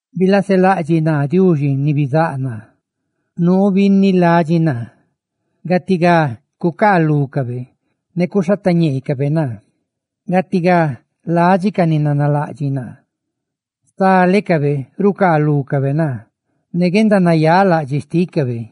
Bilaselaꞌdxiꞌ naa, Diuxi ni bizáꞌ naa, nuu binni ladxi naa; gatigá cucaalúcabe ne cuxhatañeecabe naa. Gatigá ladxi ca ni nanalaꞌdxiꞌ naa; stalecabe rucaalúcabe naa ne guendanayáꞌ laꞌdxiꞌ xtícabe.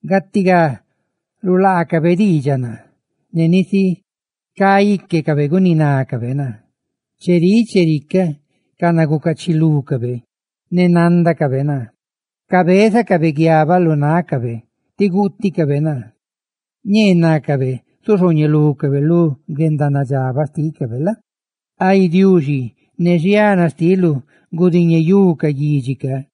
Gatigá rulaacabe diidxaꞌ naa; ne nisi cá íquecabe guninácabe naa. Cheríꞌ chericaꞌ canagucachilucabe, ne nándacabe naa, cabézacabe guiabaꞌ lu nácabe ti guuticabe naa. Ñee nácabe zuxhooñelucabe lu guendanadxabaꞌ xtícabe la? Ay, Diuxi, ne xiana xtiluꞌ gudiñeyú ca guidxi ca.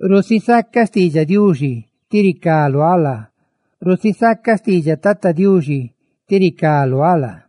Rusisaca xtiidxaꞌ Diuxi ti ricá luáꞌ laa, rusisaca xtiidxaꞌ Tata Diuxi ti ricá luáꞌ laa;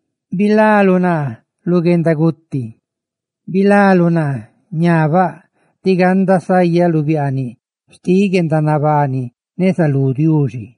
tí bilaluꞌ naa lu guendaguti, tí bilaluꞌ naa ra ñabaꞌ, tí ganda sayaꞌ lu biaaniꞌ xti guendanabani, neza lú Diuxi.